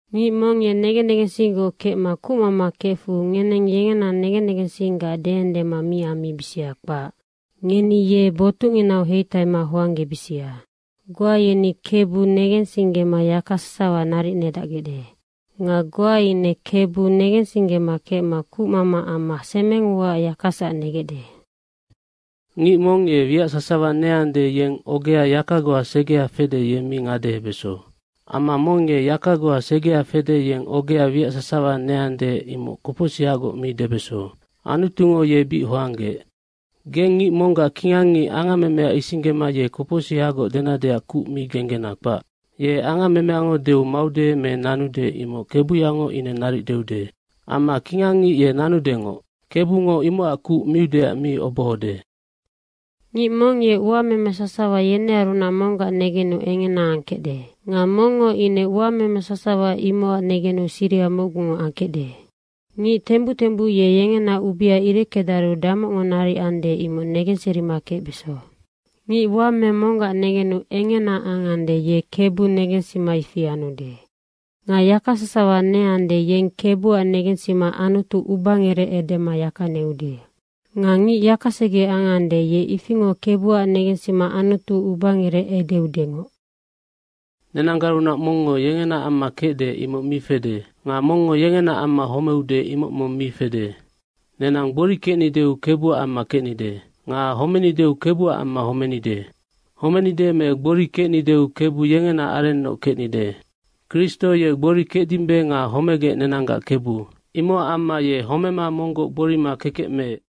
Ngic mong ye negen negensinggoc kecma kucmama kefu ngeneng yengena negen negensingaac deendema mi ambisia, kpac. Ngeni ye botucnginau heitaima hoanggebisia. Goa yeni Kebu negensinggema yaka sasawa naric nedacgecde. Nga goa ine Kebu negensinggema kecma kucmama amma semeng uaac yakasac negecde. Ngic mong ye wiac sasawa neande, yeng ogea yaka goa segea fede, ye mi ngadehebeso. Amma mong ye yaka goa segea fede, yeng ogea wiac sasawa neande, imoc kopocsihagoc mi debeso. Anutungo ye bic hoanggeec. Geng ngic monggac kingangngic angammemea isinggema ye kopocsihagoc denadeac kuc mi genggena, kpac. Ye angammemeango deu maude me nanude imoc kebuyango ine naric deude. Amma kingangngic ye nanudengoc, Kebungo imocac kuc miudeac mi obohode. Ngic mong ye uameme sasawa yenearunac monggac negenu engena angkecde. Nga mongngo ine uameme sasawa imocac negenu siriha mocgungoc angkecde. Ngic tembuc tembuc ye yengena ubea ireckedaru damocngo naric ande, imoc negenserima kecbeso. Ngic uameme monggac negenu engena angande, ye Kebu negensima ifi anude. Nga yaka sasawa neande, yeng Kebuac negensima Anutu ubangerec edema yaka neude. Nga ngic yakasege angande, ye ifingoc Kebuac negensima Anutu ubangerec edeudengoc. Nenanggarunac mongngo yengenaac amma kecde, imoc mi fede. Nga mongngo yengenaac amma homeude, imoc mong mi fede. Nenang gbori kecnideu Kebuac amma kecnide nga homenideu Kebuac amma homenide. Homenide me gbori kecnideu Kebu yengena arennoc kecnide. Kristo ye gbori kecdimbe nga homegec nenanggac Kebu, imocac amma ye homema monggoc gborima kekec meec.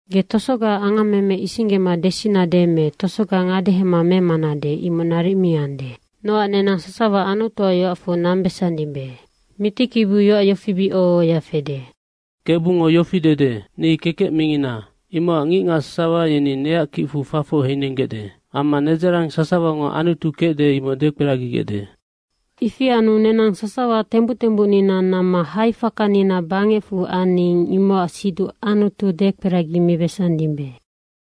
Ge tosogaac angammeme isinggema desinade me tosoga ngadehema memanade, imoc naric mi ande. Nocac nenang sasawa Anutuac yoacfu nambesandimbe. Mitikibiu yoac yofi bic oho ohoya fede, “Kebungo yofi dede, ‘Ni kekec mingina. Imocac ngicngac sasawa yeni neac kicfu fafoc heinenggecde amma nedzarang sasawango Anutu kecde, imoc dekperagigecde.’” Ifi anu nenang sasawa tembuc tembucnina namma haifakanina bangecfu aning, imocac siduc Anutu dekperagimibesandimbe.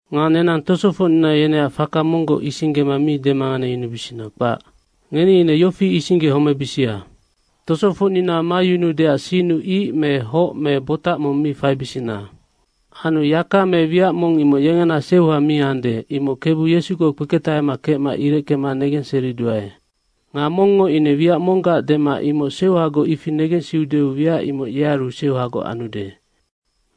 Nga nenang tosofocnina yeneac faka monggoc isinggema mi demanganeyunubisina, kpac. Ngeni ine yofi isinggehomebisia, tosofocnina mayunuudeac sinnu ic me hoc me botac mong mi faibisina. Anu yaka me wiac mong imoc yengena seuha mi ande, imoc Kebu Yesugoc kpeketahema kecma ireckema negenseriduae. Nga mongngo ine wiac monggac dema imoc seuhagoc, ifi negensiudeu, wiac imoc yearu seuhagoc anude.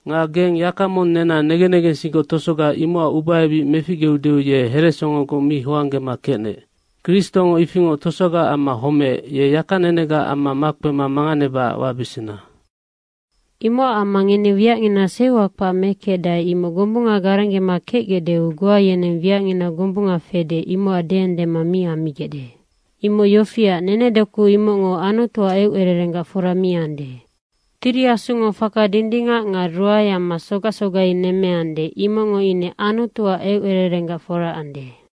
Nga geng yaka mong nena negen negensinggoc tosoga imocac ubaebic meficgeudeu ye heresongogoc mi hoanggema kecnec. Kristongo ifingoc tosogaac amma homeec, ye yaka nenegaac amma makpema manganebacac wabesena. Imocac amma ngeni wiacngina seuha kpac mekecdae, imoc gombunga garenggema kecgecdeu, goa yeneng wiacngina gombunga fede, imocac deendema mi ammigecde. Imoc yofiac, nenedoku imocngo Anutuac eucererenggac fora mi ande. Tiri Asungo faka dindingac nga ruae amma sogac sogai nemmeande, imocngo ine Anutuac eucererenggac fora ande.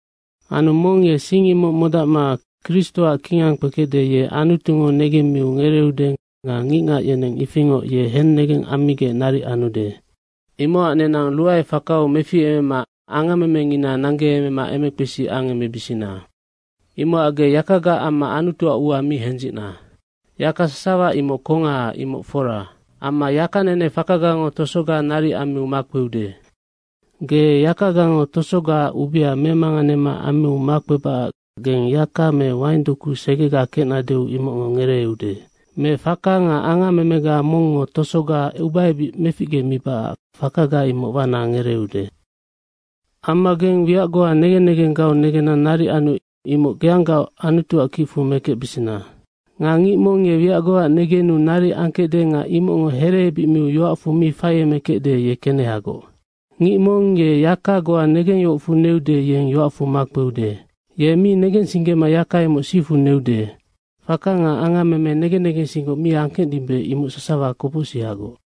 Anu mong ye sing imoc modacma Kristoac kingang kpekecde, ye Anutungo negemmiu ngereeude nga ngicngac yeneng ifingoc ye hennegeng ammigec naric anude. Imocac nenang ruaefakau meficemema angammemengina nanggeemema emekpesi angemebisina. Imocac ge yakagaac amma Anutuac ua mi hendzicna. Yaka sasawa imoc kongaha, imoc fora. Amma yaka nene fakagango tosoga naric ammiu makpeude. Ge yakagango tosogaac ubea memanganema ammiu makpebacac geng yang me waingdoku segega kecnadeu imocngo ngereeude. Me faka nga angammemega mongngo tosoga ubaebic meficgemibacac fakaga imoc wana ngereeude. Amma geng wiac goa negen negenggau negenna naric anu imoc geanggaoc Anutuac kicfu mekecbesena. Nga ngic mong ye wiac goaac negenu naric angkecde nga imocngo hereebic miu yoacfu mi faiemekecde, ye kenehagoc. Ngic mong ye yaka goa negengyohocfu neude, yeng yoacfu makpeude. Ye mi negensinggema yaka imoc sifu neude. Faka nga angammeme negen negensinggoc mi angkecdimbe, imoc sasawa kopocsihagoc.